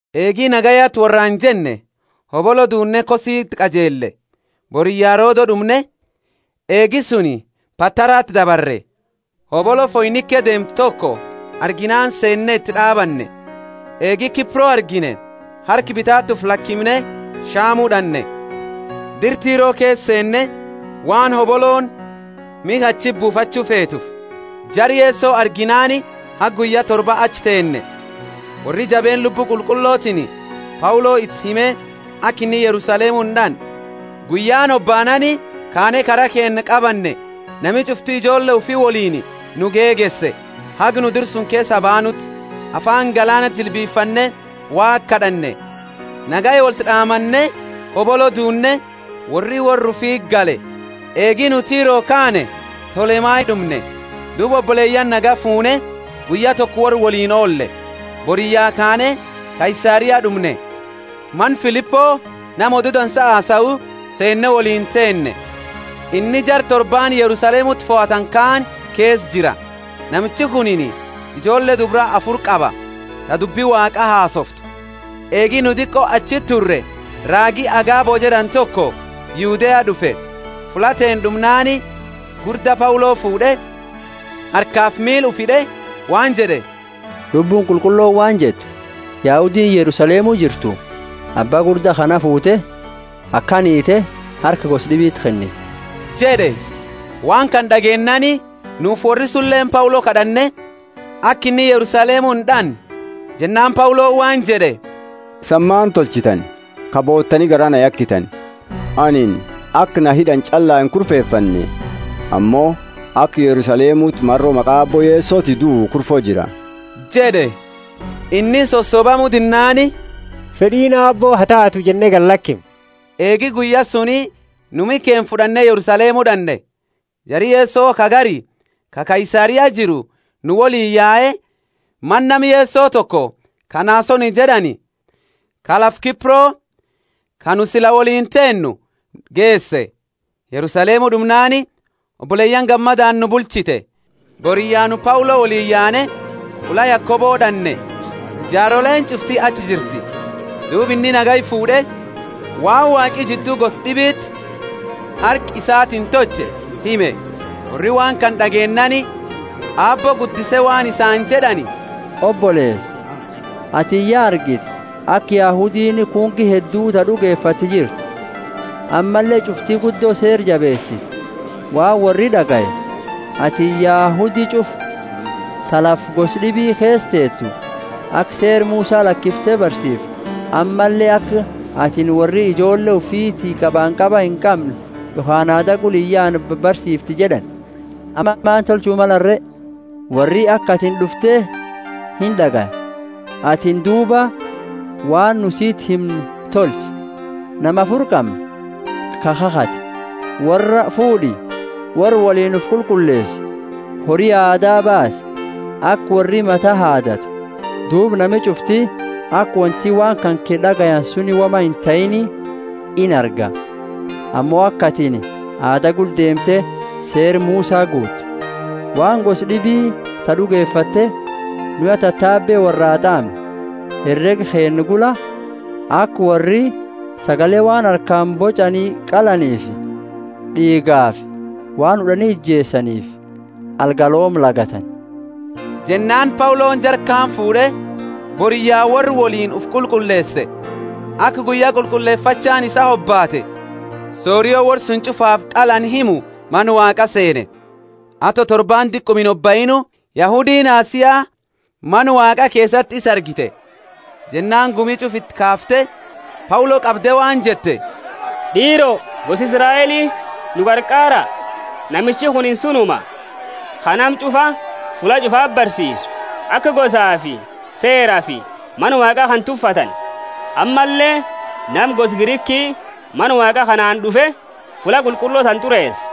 Eegi nagayaati worraani jenne, hobolo duunne Kositi qajeelle; boriyya Rodo d'umne, eegi suni Patarati dabarre. Hobolo Foinike deemtu toko arginaani seenne iti d'aabanne. Eegi Kipro argine, harka bitaati ufi lakimne Shamu d'anne, dira Tiro keesa seenne, waan hobolooni miha achiti buufachu feeteefi. Jara Yeso arginaani haga guyya torba achi teenne. Worri jabeenna Lubbu Qulqullotiini Paulo iti hime aka inni Yerusalemu ind'anne. Guyyaani hobaanaani kaane kara keenna qabanne. Nami ch'ufti ijoolle ufi woliini nu gegeese, haga nu dira keesa baanuti. Afaani galaanati jilbifanne Waaqa kad'anne. Nagaya wolti d'aamanne hobolo duunne, worri worra ufiti gale. Eegi nu Tiro kaane, Tolemai d'umne; duuba oboleyaani nagaya fuune, guyya toko worra woliini oolle. Boriyya kaane Kaisaria d'umne. Mana Filipo, nama Odu Dansa hasau, seenne woliini teenne. Inni jara torbaani Yerusalemuti fohatani kaani keesa jira. Namichi kunini ijoolle dubra afuri qaba, ta dubbi Waaqa hasooftu. Eegi nu diqo achi turre, raagi Agabo jed'ani toko, Yudea d'ufe. Fulla teenna d'umnaani gurda Paulo fuud'e, harkafi miila ufi hid'e waan jed'e, Lubbuuni Qulqullooni waan jettu, Yahudiini Yerusalemu jirtu, abba gurda kana fuute, akana hiite harka gosa d'ibiti kenniti jed'e. Waan kana d'ageennaani nufi worri sunileeni Paulo kad'anne aka inni Yerusalemu ind'anne. Jennaani Pauloni waan jed'e, Isani maani tolchitani, ka bootani garaa na yakitani? Anini aka na hid'ani ch'alla inkurfefanne, ammo aka Yerusalemuti maro maqa Aabbo Yesoti duu kurfo jira jed'e. Inni sosobamu dinnaani Fed'iini Aabbo ha taatu jenne galakimne. Eegi guyya suni nu miha keenna fud'anne Yerusalemu d'anne. Jari Yeso ka gari, ka Kaisaria jiru, nu woliini yae, mana nama Yeso toko ka Nasoni jed'ani, ka lafa Kipro, ka nu sila woliini teennu, geese. Yerusalemu d'umnaani, oboleyaani gammadaani nu bulchite. Boriyya nu Paulo woliini yaane, fulla Yakobo d'anne; jaaroleeni ch'ufti achi jirti. Duuba inni nagaya fuud'e, waan Waaqi jiddu gosa d'ibiti harka isatiini tolche hime. Worri waan kana d'ageennaani Aabbo guddise waan isaani jed'ani, Oboleesa, atini ya argite, aka Yahudiini kunki heddu ta d'ugefatte jirtu, ammalle ch'ufti guddo Seera jabeesiti. Waan worri d'agaye, atini Yahudi ch'ufa ta lafa gosa d'ibi keesa teetu, aka Seera Musa lakiftu barsiifte, ammalle aka atini worri ijoolle ufiti qabanqaba inqamne yokhaani aada gula iyaane barsiifte jed'ani. Amma maani tolchu malani re? Worri aka atini d'ufte ind'agaya. Atini duuba waan nu siti himnu tolchi. Nama afuri qamna, ka kakhate. Worra fuud'i, worra woliini ufi qulqulleesi, hori aadaa baasi, aka worri mata haadatu. Duuba nami ch'ufti aka wonti waan kanke d'agayani suni woma intahiini inarga, ammo aka atini aada gula deemte Seera Musa guuttu. Waan gosa d'ibi ta d'ugefatte, nu ya tatabe worraa t'aamne, herega keenna gula, aka worri sagale waan harkaani boch'ani qalaniifi d'iigafi waan hud'ani ijeesaniifi algalooma lagatani. Jennaani Pauloni jara kaani fuud'e, boriyya worra woliini ufi qulqulleese, aka guyya qulqullefachaani isaa hobaate sorio worra suni ch'ufaafi qalani himu Mana Waaqa seene. Ato torbaani diquma inhobaiini, Yahudiini Asia Mana Waaqa keesati isa argite, jennaani gumi ch'ufa iti kaafte Paulo qabde waan jette, D'iiro, gosa Israeli, nu qarqaara! Namichi kunini sunuma, ka nama ch'ufa fulla ch'ufati barsiisu, aka gosafi Seerafi Mana Waaqaa kana tuffatani. Ammalle nama gosa Griki Mana Waaqa kanaani d'ufe, fulla qulqullo tana t'ureese.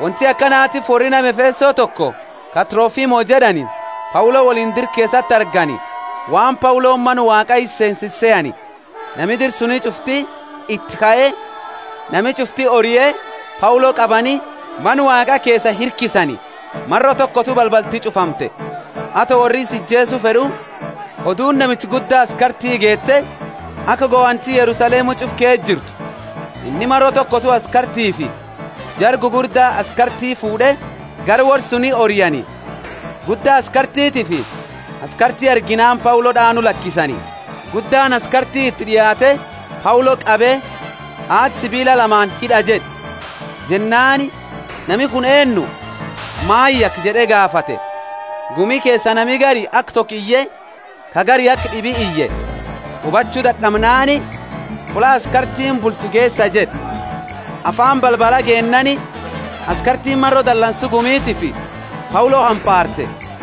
Wonti akanatiifi worri nama Efeso, toko, ka Trofimo jed'ani, Paulo woliini dira keesati argani, waan Pauloni Mana Waaqaa isa seensise sehani. Nami dira suni ch'ufti iti kae, nami ch'ufti orie, Paulo qabani, Mana Waaqa keesaa hirkisani. Maro tokotu balbalti ch'ufamte. Ato worri isa ijeesu fed'u, oduuni namicha gudda askarti geete, aka gohanti Yerusalemu ch'ufa keesa jirtu. Inni maro tokotu askartiifi jara gugurda askarti fuud'e, gara worra suni oriani. Gudda askartitiifi askarti arginaani Paulo d'aanu lakisani. Guddaani askarti iti d'iaate, Paulo qabe, Haada sibiila lamaani hid'a jed'e. Jennaani, Nami kuni eennu, maani yake? jed'e gaafate. Gumi keesa nami gari aka toko iye, ka gari aka d'ibi iye. Hubachu dad'amnaani, Fulla askartiini bultu geesa jed'e. Afaani balbala geennaani, askartiini maro dalansu gumitiifi Paulo hampaarte.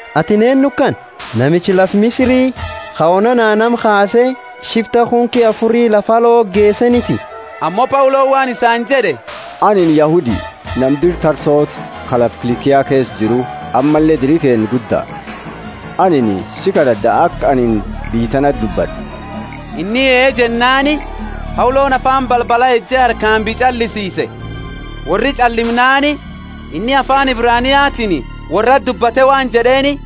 Atini eennu kana? Namicha lafa Misiri, ka onana nama kaase shifta kunki afuri lafa alo geeseeniti? Ammo Pauloni waan isaani jed'e, Anini Yahudi, nama dira Tarsoti, ka lafa Kilikia keesa jiru; ammalle diri keenna gudda. Anini sii kad'ad'a aka anini biyya tanati dubbad'u. Inni ee jennaani, Pauloni afaani balbala eje harkaani biyya ch'allisiise. Worri ch'allimnaani, inni afaani Ebraniatiini worrati dubbate waan jed'eeni: